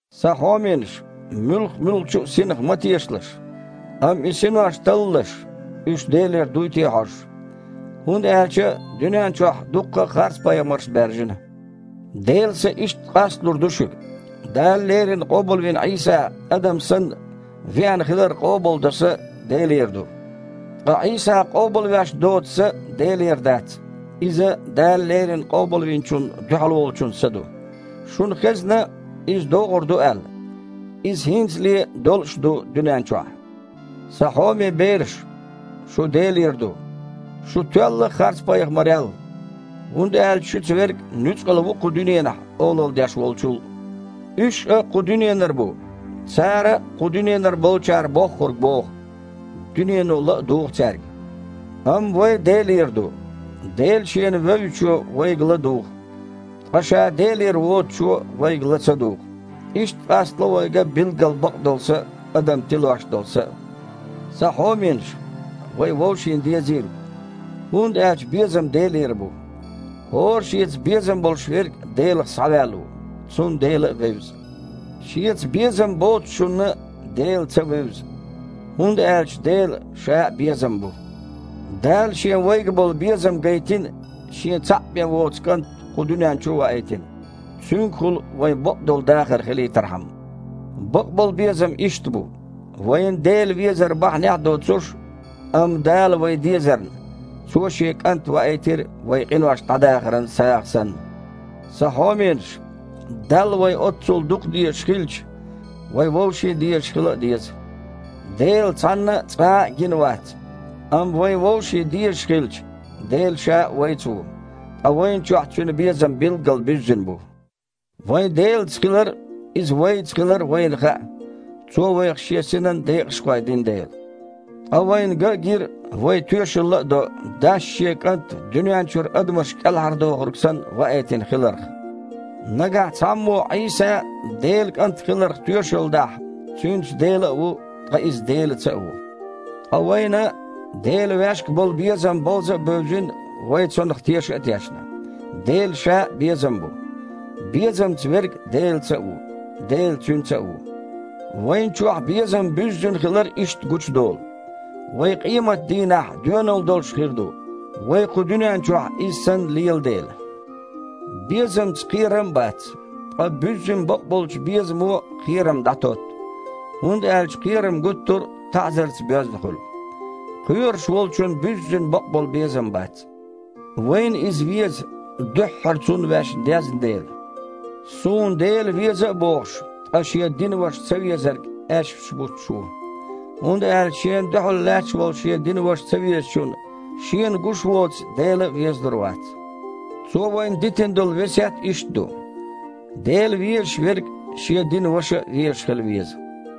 Сан хьоменаш! Муьлх-муьлххачу а синах ма тешалаш, амма и синош таллалаш, уьш Делера дуй те а хьожуш. ХІунда аьлча дуьнен чохь дукха харцпайхамарш баьржина. Делан Са иштта къасталур ду шуьга: Дала леррина къобалвина Іийса, адам санна, веана хилар къобалдо са – Делера ду. Ткъа Іийса къобалвеш доцу са – Делера дац, иза – Дала леррина Къобалвинчунна дуьхьал волчун са ду. Шуна хезна, иза догІур ду аьлла, иза хІинцале а долуш а ду дуьнен чохь. Сан хьоме бераш! Шу Делера ду. Шу тоьлла харцпайхамарел, хІунда аьлча шуьца Верг нуьцкъала ву кху дуьненахь олалла деш волчул. Уьш кху дуьненара бу, цара а кху дуьненара болчара боххург боху, дуьнено ла а дугІу цаьрга. Амма вай Делера ду. Дела шена вевзачо вайга ла а дугІу. Ткъа ша Делера воцучо вайга ла ца дугІу. Иштта къастало вайга билггал бакъдолу са а, адам тилош долу са а. Сан хьоменаш! Вай вовшийн дезийла, хІунда аьлча безам Делера бу. ХІора шеца безам болуш верг Делах схьаваьлла ву, цунна Дела а вевза. Шеца безам боцучунна Дела ца вевза, хІунда аьлча Дела Ша а безам бу! Дала Шен вайга болу безам гайтина, Шен цхьаъ бен воцу КІант кху дуьнен чу а ваийтина, Цуьнгахула вайн бакъдолу дахар хилийтархьама. Бакъболу безам иштта бу: вайна Дела везар бахьанехь а доцуш, амма Далла вай дезарна, Цо Шен КІант ваийтира вайн къинош дІадахаран сагІа санна. Сан хьоменаш! Далла вай оццул дукха дезаш хилча, вай вовшийн дезаш хила а деза. Дела цхьанна а, цкъа а гина вац. Амма вайна вовшийн дезаш хилча, Дела Ша а вайца ву, ткъа вайна чохь Цуьнан безам а билггал буьззина бу. Вайн Делаца хилар а, Иза вайца хилар а вайна хаьа, Цо вайх Шен Синан декъашхой дина дела. Ткъа вайна ган а гира, вай тоьшалла а до Дас Шен КІант дуьнен чуьра адамаш КІелхьардохург санна ваийтина хиларх. Нагахь цхьаммо Іийса Делан КІант хиларх тоьшалла дахь, цуьнца Дела а ву, ткъа иза Делаца а ву. Ткъа вайна Делан ваьшга болу безам бовза а бевзина, вай цунах теша а тешна. Дела Ша а безам бу. Безамца верг Делаца а ву, Дела цуьнца а ву. Вайна чохь безам буьззина хилар иштта гучудолу: вай къематан дийнахь доьналла долуш хир ду, вай кху дуьнен чохь Иза санна лела дела. Безамца кхерам а бац. Ткъа буьззина бакъболчу безамо кхерам дІатотту, хІунда аьлча кхерам гуттар а таІзарца боьзна хуьлу. Кхоьруш волчун буьззина бакъболу безам бац. Вайна Иза веза, дуьххьара Цунна ваьш дезна дела. Суна Дела веза а бохуш, ткъа шен динан ваша цавезарг аьшпаш буттуш ву. ХІунда аьлча шена дуьхьал лаьтташ волу шен динан ваша цавезачунна, шена гуш воцу Дела а везалур вац! Цо вайна дитина долу весет иштта ду: «Дела везаш верг шен динан ваша а везаш хила веза».